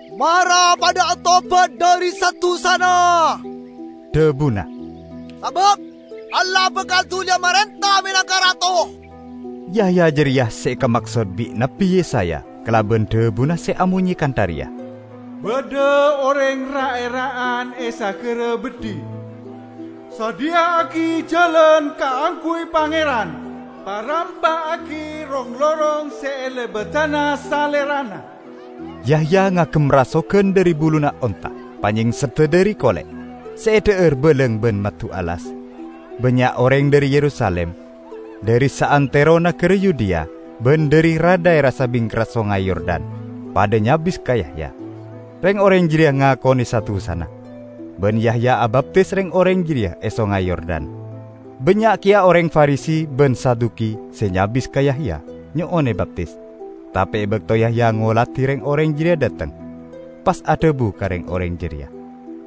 "Mara padha atobat dhari sa-dusana," dhabuna, "sabab Allah bakal duliya marenta menangka Rato!" Yahya jareya se ekamaksod bi' Nabbi Yesaya kalaban dhabuna se amonye kantha reya, "Badha oreng ra'-era'an e sagara beddhi, 'Sadhiya'agi jalan kaangguy Pangeran; parampa'agi rong-lorong se elebadana Salerana.' " Yahya ngagem rasogan dhari buluna onta. Panyengsedda dhari kole', se edha'ar balang ban maddu alas. Bannya' oreng dhari Yerusalim, dhari saantero nagara Yudea ban dhari ra-dhaera e sabingkerra Songay Yordan padha nyabis ka Yahya. Reng-oreng jareya ngakone sa-dusana, ban Yahya abaptis reng-oreng jareya e Songay Yordan. Bannya' keya oreng Farisi ban Saduki se nyabis ka Yahya nyo'on ebaptis. Tape e bakto Yahya ngoladi reng-oreng jareya dhateng, pas adhabu ka reng-oreng jareya,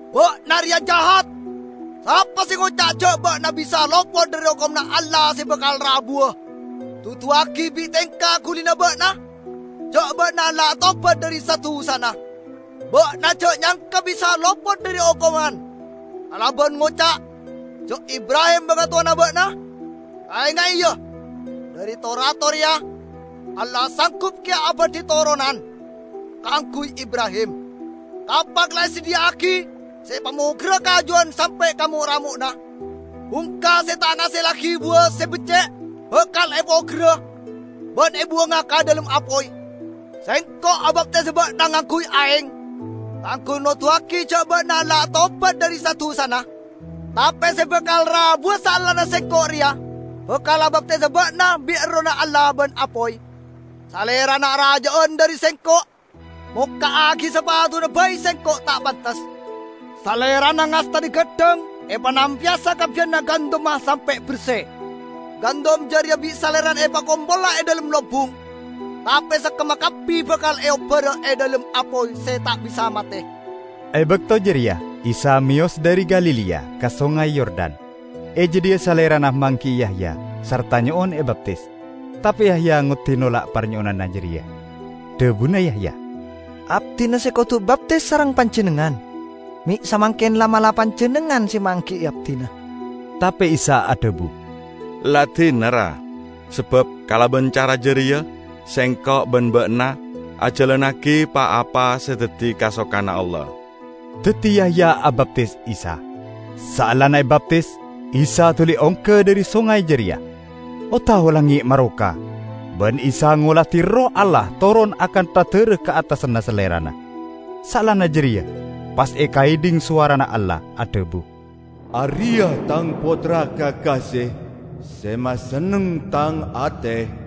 "Ba'na reya jahat! Sapa se ngoca' ja' ba'na bisa lopot dhari okomanna Allah se bakal rabuwa? Duduwagi bi' tengka gulina ba'na ja' ba'na la atobat dhari sa-dusana. Ba'na ja' nyangka bisa'a lopot dhari okoman kalaban ngoca' ja' Ibrahim bangatowana ba'na. Kaenga'e ya, dhari to-bato reya Allah sanggup keya abadhi toronan kaangguy Ibrahim! Kapak la esadhiya'agi se epamogerra kajuwan sampe' ka mo'-ramo'na. Bungka se ta' ngasellagi buwa se becce' bakal epogerra ban ebuwanga ka dhalem apoy. Sengko' abaptis ba'na ngangguy aeng kaangguy noduwagi ja' ba'na la atobat dhari sa-dusana; tape se bakal rabuwa saellana sengko' reya, bakal abaptisa ba'na bi' Errohna Allah ban apoy. Salerana araja'an dhari sengko'. Mokka'agi sapatuna bai sengko' ta' pantes. Salerana ngastane gaddhang epanampeya sakabbiyanna gandumma sampe' berse. Gandum jareya bi' salerana epakompola e dhalem lombung, tape sekkemma kabbi bakal eobbara e dhalem apoy se ta' bisa mate." E bakto jareya Isa meyos dhari Galilea ka Songay Yordan. E jadhiya Salerana manggi'i Yahya sarta nyo'on ebaptis. Tape Yahya ngoddi nolak parnyo'onanna jareya. Dhabuna Yahya, "Abdina se kodu ebaptis sareng Panjennengngan. Me' samangken la'-mala' Panjennengngan se manggi'i abdina." Tape Isa adhabu, "La dina, ra. Sabab kalaban cara jareya Sengko' ban ba'na ajalannagi pa-apa se daddi kasokanna Allah." Daddi Yahya abaptis Isa. Saellana ebaptis, Isa duli ongga dhari songay jareya. O-tao langnge' maroka ban Isa ngoladi Erroh Allah toron akantha dara ka attasanna Salerana. Saellana jareya pas ekaedhing sowarana Allah adhabu, "Areya' Tang Pottra kakase, se masenneng Tang ate."